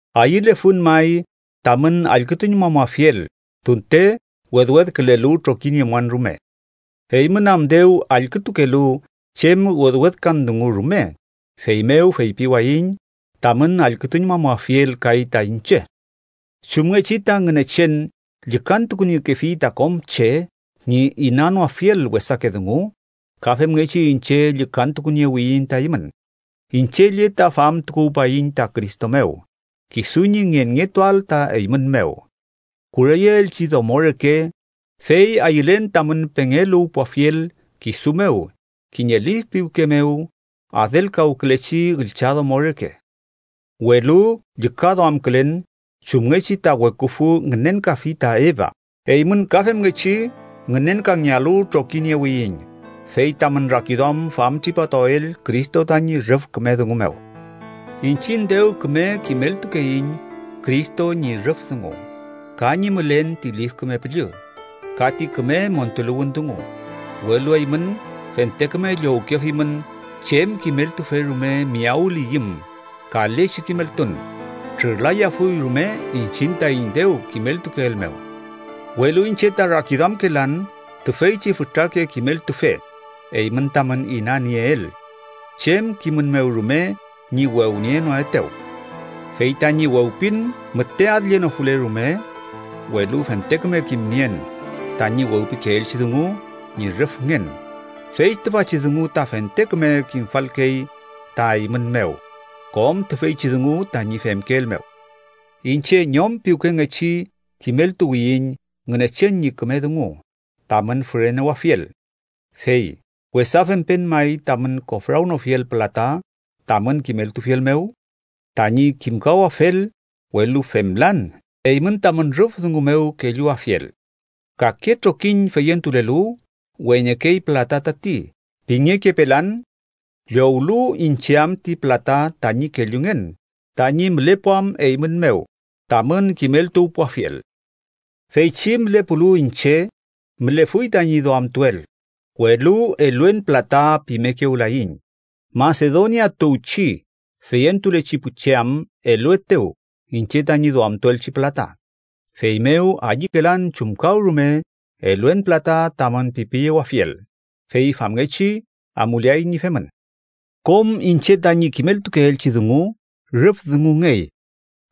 ¡Ayülefun may tamün allkütuñmamuafiel tunte wedwedkülelu trokiniemuan rume! Eymün am dew allkütukelu chem wewedkan dungu rume, feymew feypiwayiñ tamün allkütuñmamuafiel kay ta iñche. Chumngechi ta Ngünechen llükantukuniekefi ta kom che ñi inanoafiel wesake dungu, ka femngechi iñche llükantukuniewiyiñ ta eymün. Iñche lle ta famtukuwpayiñ ta Cristo mew kisu ñi ngenngetuael ta eymün mew, kureyeelchi domo reke, fey ayülen tamün pengeluwpuwafiel kisu mew kiñe lif piwke mew adelkawkülechi üllchadomo reke. Welu llükaduamkülen chumngechi ta weküfü ngünenkafi ta Eva, eymün ka femngechi ngünenkangealu trokiniewiyiñ, fey tamün rakiduam famtripatuael Cristo tañi rüf küme dungu mew. Iñchiñ dew küme kimeltukeiñ Cristo ñi rüf dungu, ka ñi mülen ti Lif Küme Püllü, ka ti küme montuluwün dungu, welu eymün fente küme llowkefimün chem kimeltufe rume miyawliyüm kalechi kimeltun trürlayafuy rume iñchiñ taiñ dew kimeltukeel mew. Welu iñche ta rakiduamkelan tüfeychi fütrake kimeltufe eymün tamün inanieel chem kimün mew rume ñi wewnienoetew. Fey tañi wewpin müte adllenofule rume, welu fente küme kimnien tañi wewpikeelchi dungu ñi rüfngen, fey tüfachi dungu ta fente küme kimfalkey ta eymün mew kom tüfeychi dungu tañi femkeel mew. Iñche ñom piwkengechi kimeltuwiyiñ Ngünechen ñi küme dungu tamün fürenewafiel. Fey, ¿wesa fempen may tamün kofrawnofiel pülata tamün kimeltufiel mew? Tañi kimkawafel, welu femlan eymün tamün rüf dungu mew kelluafiel. Kake trokiñ feyentulelu “weñekey pülata tati” pingekepelan, llowlu iñche am ti pülata tañi kellungen tañi mülepuam eymün mew tamün kimeltuwpuafiel. Feychi mülepulu iñche mülefuy tañi duamtuel, welu “eluen pülata” pimekewlayiñ, Masedonia tuwchi feyentulechi pu che am eluetew iñche tañi duamtuelchi pülata. Feymew ayükelan chumkawrume “eluen pülata” tamün pipiyewafiel, fey famngechi amuleay ñi femün. Kom iñche tañi kimeltukeelchi dungu rüf dungungey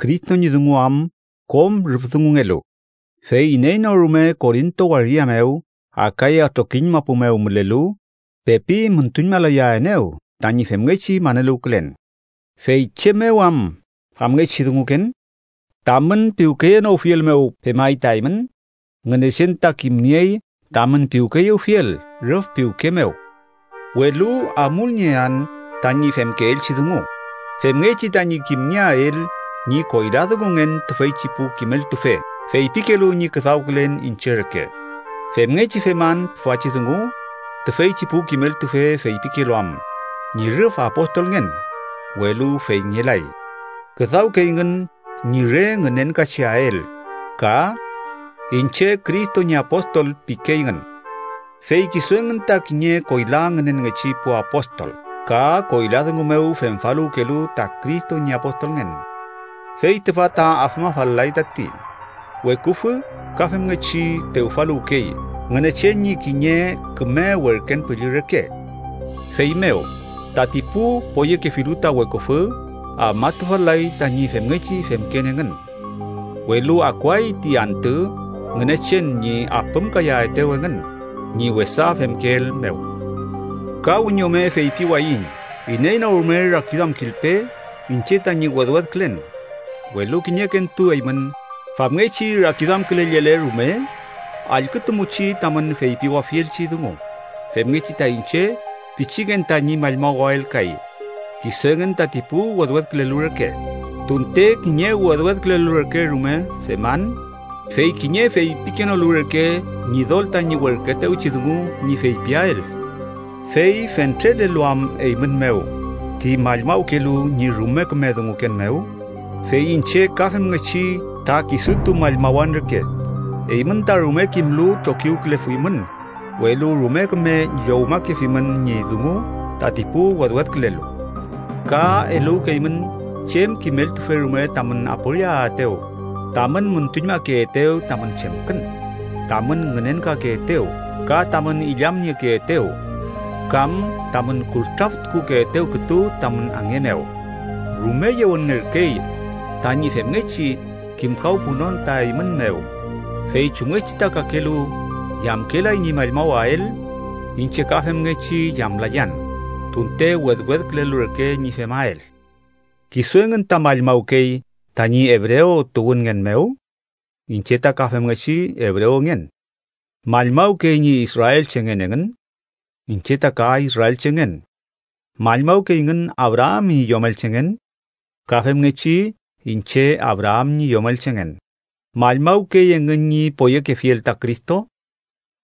Cristo ñi dungu am kom rüf dungungelu, fey iney no rume Korinto waria mew Akaya trokiñ mapu mew mülelu pepi müntuñmalayaenew tañi femngechi maneluwkülen. ¿Fey chem mew am famngechi dunguken? ¿Tamün piwkeyewnofiel mew pemay ta eymün? ¡Ngünechen ta kimniey tamün piwkeyewfiel rüf piwke mew! Welu amulniean tañi femkeelchi dungu, femngechi tañi kimngeael ñi koyladungungen tüfeychi pu kimeltufe feypikelu ñi küdawkülen iñche reke. Femngechi feman tüfachi dungu tüfeychi pu kimeltufe feypikelu am ñi rüf apostolngen, welu feyngelay. Küdawkeyngün ñi re ngünenkacheael ka “iñche Cristo ñi apostol” pikeyngün. Fey kisu engün ta kiñe koyla ngünenngechi pu apostol ka koyla dungu mew femfaluwkelu ta Cristo ñi apostolngen. Fey tüfa ta afmafal-lay tati, weküfü ka femngechi pewfaluwkey Ngünechen ñi kiñe küme werken püllü reke. Feymew tati pu poyekefilu ta weküfü afmatufal-lay tañi femngechi femken engün. ¡Welu akuay ti antü Ngünechen ñi apümkayaetew engün ñi wesa femkeel mew! Ka wiñome feypiwayiñ iney no rume rakiduamkilpe iñche tañi wedwedkülen, welu kiñekentu eymün famngechi rakiduamkülellele rume, allkütumuchi tamün feypiwafielchi dungu, femngechi ta iñche pichiken tañi mallmawael kay kisu engün tati pu wedwedkülelu reke. Tunte kiñe wedwedkülelu reke rume feman, fey kiñe feypikenolu reke Ñidol tañi werküetewchi dungu ñi feypiael. Fey fentrelelu am eymün mew ti mallmawkelu ñi rume küme dunguken mew, ¡fey iñche ka femngechi ta kisutu mallmawan reke! Eymün ta rume kimlu trokiwkülefuymün, welu rume küme llowmakefimün ñi dungu tati pu wedwedkülelu. Ka eluwkeymün chem kimeltufe rume tamün aporiaetew, tamün müntuñmakeetew tamün chemkün, tamün ngünenkakeetew, ka tamün illamniekeetew kam tamün kultraftukukeetew kütu tamün ange mew. ¡Rume yewenngerkey tañi femngechi kimkawpunon ta eymün mew! Fey chumngechi ta kakelu yamkelay ñi mallmawael, iñche ka femngechi yamlayan, tunte wedwedkülelu reke ñi femael. ¿Kisu engün ta mallmawkey tañi ebrew tuwünngen mew? Iñche ta ka femngechi ebrewngen. ¿Mallmawkey ñi israelchengen engün? Iñche ta ka israelchengen. ¿Mallmawkeyngün Abraam ñi yomelchengen? Ka femngechi iñche Abraam ñi yomelchengen. ¿Mallmawkey engün ñi poyekefiel ta Cristo?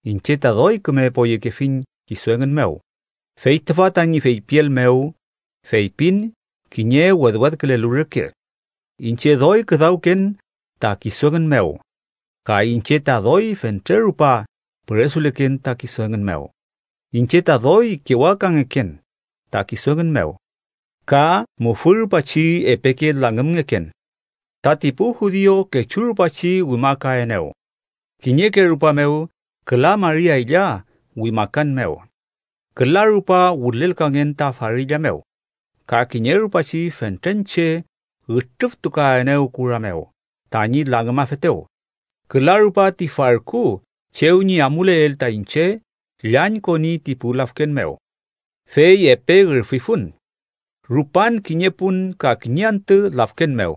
Iñche ta doy küme poyekefiñ kisu engün mew. Fey tüfa tañi feypiel mew, feypin kiñe wedwedkülelu reke. Iñche doy küdawken ta kisu engün mew, ka iñche ta doy fentre rupa püresuleken ta kisu engün mew, iñche ta doy kewakangeken ta kisu engün mew, ka mufü rupachi epeke langümngeken. Tati pu judiu kechu rupachi wimakaenew, kiñeke rupa mew küla mari aylla wimakan mew. Küla rupa wülelkangen ta farilla mew, ka kiñe rupachi fentren che ütrüftukaenew kura mew tañi langümafetew. Küla rupa ti farku chew ñi amuleel ta iñche llañkoni ti pu lafken mew, fey epe ürfifun. Rupan kiñe pun ka kiñe antü lafken mew.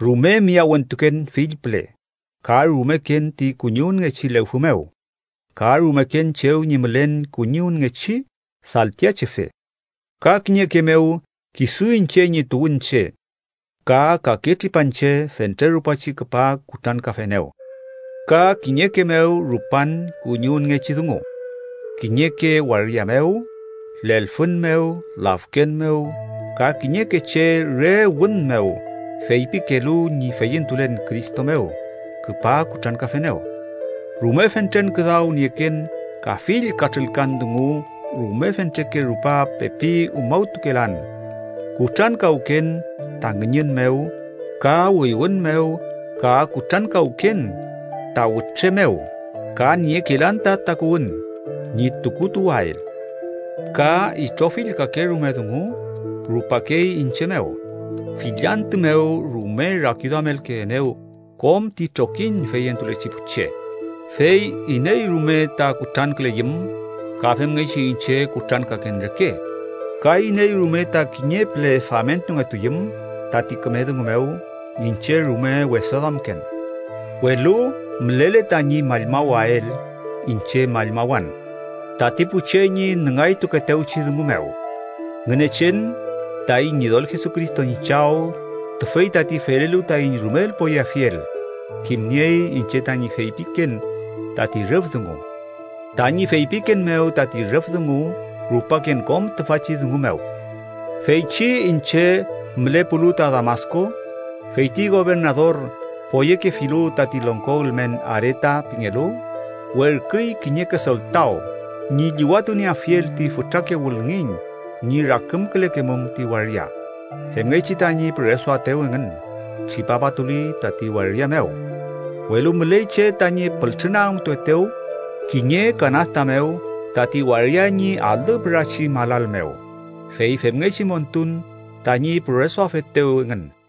Rume miyawentuken fill püle, ka rumeken ti kuñiwünngechi lewfü mew, ka rumeken chew ñi mülen kuñiwünngechi saltiachefe, ka kiñeke mew kisu iñche ñi tuwünche ka kake tripanche fentre rupachi küpa kutrankafenew. Ka kiñeke mew rupan kuñiwünngechi dungu kiñeke waria mew, lelfün mew, lafken mew, ka kiñeke che re wün mew feypikelu ñi feyentulen Cristo mew küpa kutrankafenew. Rume fentren küdaw nieken ka fill katrülkan dungu, rume fentreke rupa pepi umawtukelan, kutrankawken ta ngüñün mew ka wüywün mew, ka kutrankawken ta wütre mew ka niekelan ta takuwün ñi tukutuwael. Ka itrofill kakerume dungu rupakey iñche mew. Fill antü mew rume rakiduamelkeenew kom ti trokiñ feyentulechi pu che. Fey iney rume ta kutranküleyüm, ka femngechi iñche kutrankaken reke, ka iney rume ta kiñe püle famentungetuyüm tati küme dungu mew, iñche rume wesaduamken. Welu mülele tañi mallmawael, iñche mallmawan tati pu che ñi nüngaytukeetewchi dungu mew. Ngünechen, taiñ Ñidol Jesucristo ñi Chaw, tüfey tati felelu taiñ rumel poyeafiel kimniey iñche tañi feypiken tati rüf dungu. Tañi feypiken mew tati rüf dungu, rupaken kom tüfachi dungu mew. Feychi iñche mülepulu ta Damasku, fey ti gobernador, poyekefilu tati longko ülmen Areta pingelu, werküy kiñeke soltaw ñi llüwatunieafiel ti fütrake wülngiñ ñi rakümkülekemum ti waria, femngechi tañi püresuaetew engün tripapatuli tati waria mew. Welu müley che tañi pültrünagümtuetew kiñe kanasta tati waria ñi alü pürachi malal mew, fey femngechi montun tañi püresuafetew engün.